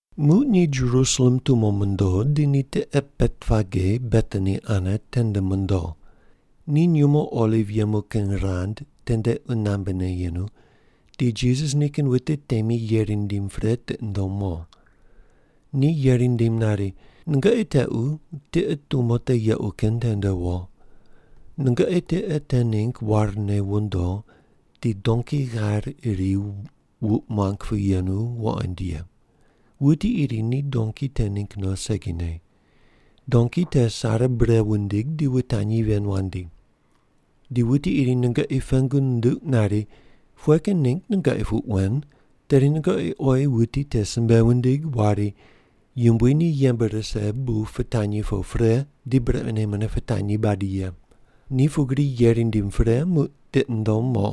Muq ni Jerusalem tumo mondo di ni tiqe Betpage Betani ane tende mondo. Ni nyumo oliv yemu kin rand tende qunambe yemu di Jisas nikin wute temi yeri nindim pre tiqi nundom mo. Ni yeri nindim nari, “Nungoqi tequ tiqe tumo te yequ kin tende wo. Nungoqi tiqe te ningg warne wondo di donki ghair iri wuq muang pu yenu wuqoind ye. Wuti iri ni donki te ningg no segine. Donki te sare bure wundig di wutanyi ven wandi. Di wuti iri nungoqi pengu nunduq nari, ‘Pughe kin ningg nungoqi puq wen?’ tedi nungoqi oyi wuti te simbe wundig wari, ‘Yumbui ni yembe rise bu pitanyi po pre di brequne mune pitanyi badi ye’.” Ni pugri yeri nindim pre muq tiqi nundom mo.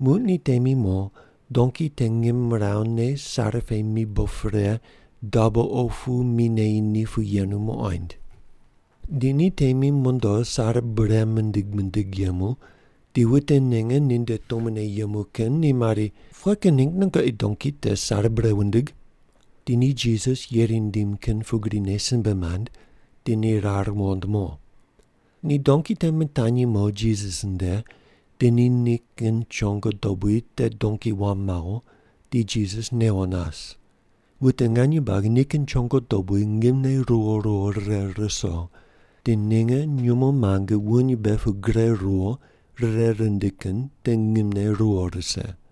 Muq ni temi mo donki te ngimrawu ne sare pe mibo pre dabo opu mi neyi ni pu yenu muqoind. Di ni temi mondo sare bure mindig mindig yemu di wute ninge ninde tumone yemu kin ni mari, “Pughe kin ningg nungoqi donki te sare bure wundig?” Di ni Jisas yeri nindim kin pugrine simbe mand, di ni rar muqond mo. Ni donki te mitanyi mo Jisas nde di ni nikin chongo dobui te donki wam mawo, di Jisas newo nas. Wute nganye buagi nikin chongo dobui ngimne ruwo ruwo rire ruso di ninge nyumo muange wuny mbe pu gure ruwo rire rindi kin te ngimne ruwo rise.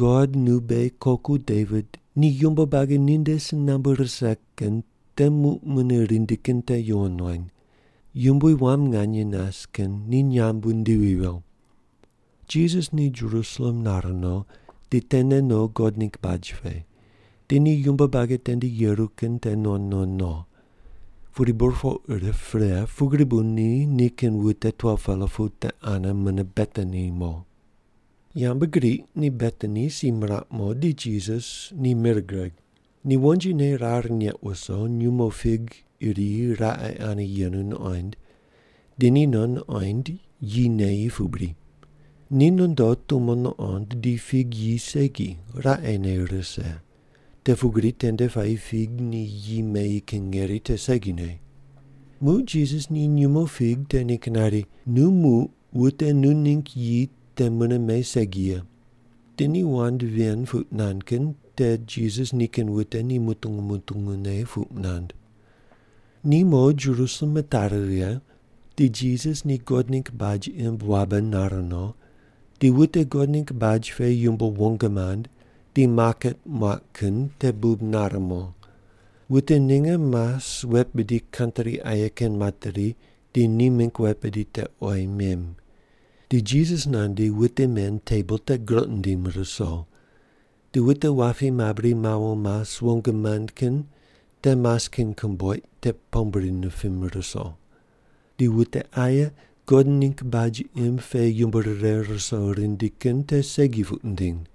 God, nu beghi koku Devit ni yumbo buagi ninde si nambu rise kin te muq mune rindi kin te yuwon wany. Yumbui wam nganye nas kin ni nyamb wundivi viyo.” Jisas ni Jerusalem nar no di tene no God ningg baj pe, di ni yumbo buagi tende yeru kin te nuqond nuqond no. Pudi burpoq rip pre pugri bu ni nikin wute 12-pela pu te ane mune Betani mo. Yambgriq ni Betani si miraq mo di Jisas ni mir gureg. Ni wonjine rar neq wuso, nyumo fig iri raqe ane yenu nuqoind, di ni no nuqoind, yi neyi pu bri. Ni nondo tumo nuqond di fig yi segi, raqene rise, te pugri tende puayi fig ni yi meyi kin ngeri te segine. Muq Jisas ni nyumo fig te ningg nari, “Nu muq wute nu ningg yi te mune me segi ye.” Di ni wand ven puq nand kin te Jisas nikin wute ni mutungu mutungu ne puq nand. Ni mo Jerusalem mitari righe, di Jisas ni God ningg baj imb wabe nar no, di wute God ningg baj pe yumbo wong mand di maket muaq kin te bub nare mo. Wute ninge mas wet bidi kantri aye kin materi di ni mingg wet bidi te oyi mem. Di Jisas nandi wute men tebol te groq nindim ruso, di wute wapi mabri mawo mas wong mand kin ni mas kin komboiq te pombri nipim ruso. Di wute aye God ningg baj imb pe yumbo rire ruso rindi kin te segi puq nindiny.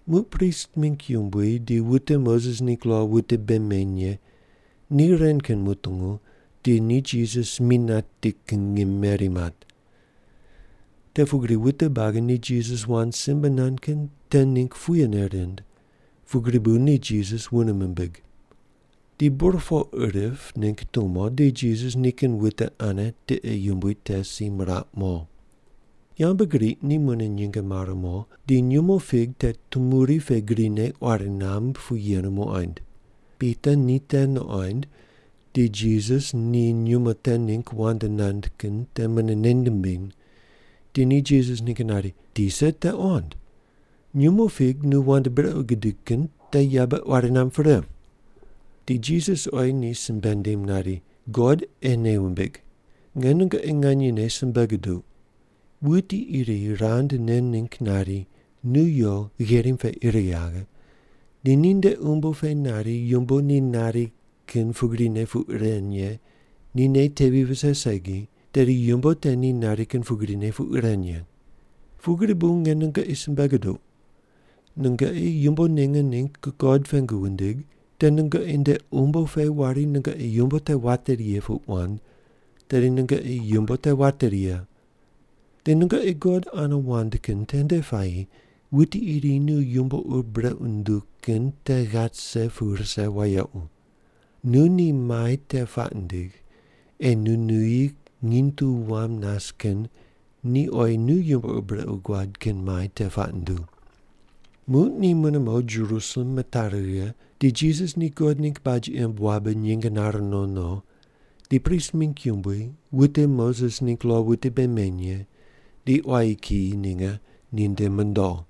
Muq prist mingg yumbui di wute Moses ningg lo wute bei meny ye ni ren kin mutungu di ni Jisas mi nati kin ngim meri mat. Te pugri wute buagi ni Jisas wand simbe nand kin te ningg puyene rind, pugri bu ni Jisas wune mimbig. Di burpoq rip ningg tumo di Jisas nikin wute ane tiqe yumbui te si miraq mo. Yambgriq ni mune nyinge mare mo di nyumo fig te tumuri pe grine quari namb pu yenu muqoind. Pita ni te nuqoind di Jisas ni nyumo te ningg wand nand kin te mune nei nimbiny di ni Jisas ningg nari, “Tisa, te qond! Nyumo fig nu wand brequ gudig kin te yabe quari namb pre.” Di Jisas oyi ni simbe nindim nari, “God ei nei wumbig. Nge nungoqi nganyene simbe guduq, wuti iri rand nen ningg nari, ‘Nu yo gherim pe ir yaghe,’ di ninde umbo pe nari yumbo te ni nari kin pugrine puq ren ye ni nei tevi vise segi, tedi yumbo te ni nari kin pugrine puq ren ye. Pugri bu nge nungoqi simbe guduq, nungoqi yumbo ninge ningg God pengu wundig te nungoqi nde umbo pe wari nungoqi yumbo te wateri ye puq wand, tedi nungoqi yumbo te wateri ye. Di nungoqi God ane wand kin tende puayi wuti iri nu yumbo ur brequ nunduw kin te ghat rise pu rise wayequ. Nu ni mai te puaq ndig ei nu nuyi nginy tu wam nas kin ni oyi nu yumbo ur brequ guad kin mai te puaq nunduw.” Muq ni mune mo Jerusalem mitari righe di Jisas ni God ningg baj imb wabe nyinge nare no no di prist mingg yumbui, wute Moses ningg lo wute bei meny ye di quayi kiyi ninge ni nde mondo.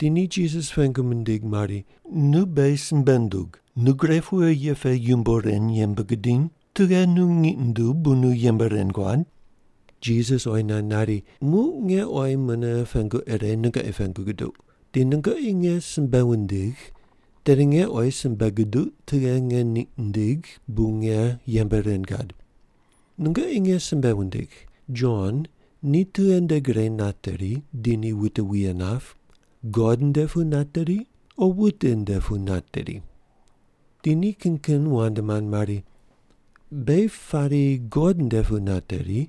Di ni Jisas pengu mindig mari, “Nu beghi simbe ndug, nu gre pughe ye pe yumbo ren yembe gudiny? Tughe nu ngiq nunduw bu nu yembe ren guad?” Jisas oyi nand nari, “Muq nge oyi mune pengu ire nungoqi pengu guduq, di nungoqi nge simbe wundigh tedi nge oyi simbe guduq tughe nge ngiq nindigh bu nge yembe ren gad. Nungoqi nge simbe wundigh, Jon ni tughe nde gre nateri di ni wute wuye nap? God nde pu nateri o wute nde pu nateri?” Di ni kin kin wand mand mari, “Beghi pari God nde pu nateri,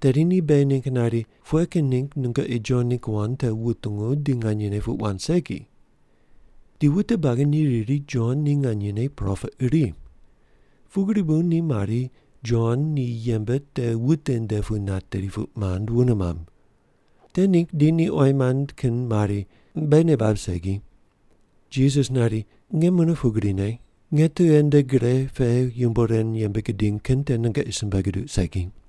tedi ni beghi ningg nari, ‘Pughe kin ningg nungoqi Jon ningg wand te wutungu di nganyene puq wand segi’?” Di wute buagi ni riri Jon ni nganyene propet iri, pugri bu ni mari, “Jon ni yembe te wute nde pu nateri,” puq mand wune mamb. Te ningg di ni oyi mand kin mari, “Beghi nei bab segi.” Jisas nari, “Nge mune pugrine, nge tughe nde gre pe yumbo ren yembe gidiny kin te nungoqi simbe guduq segi.”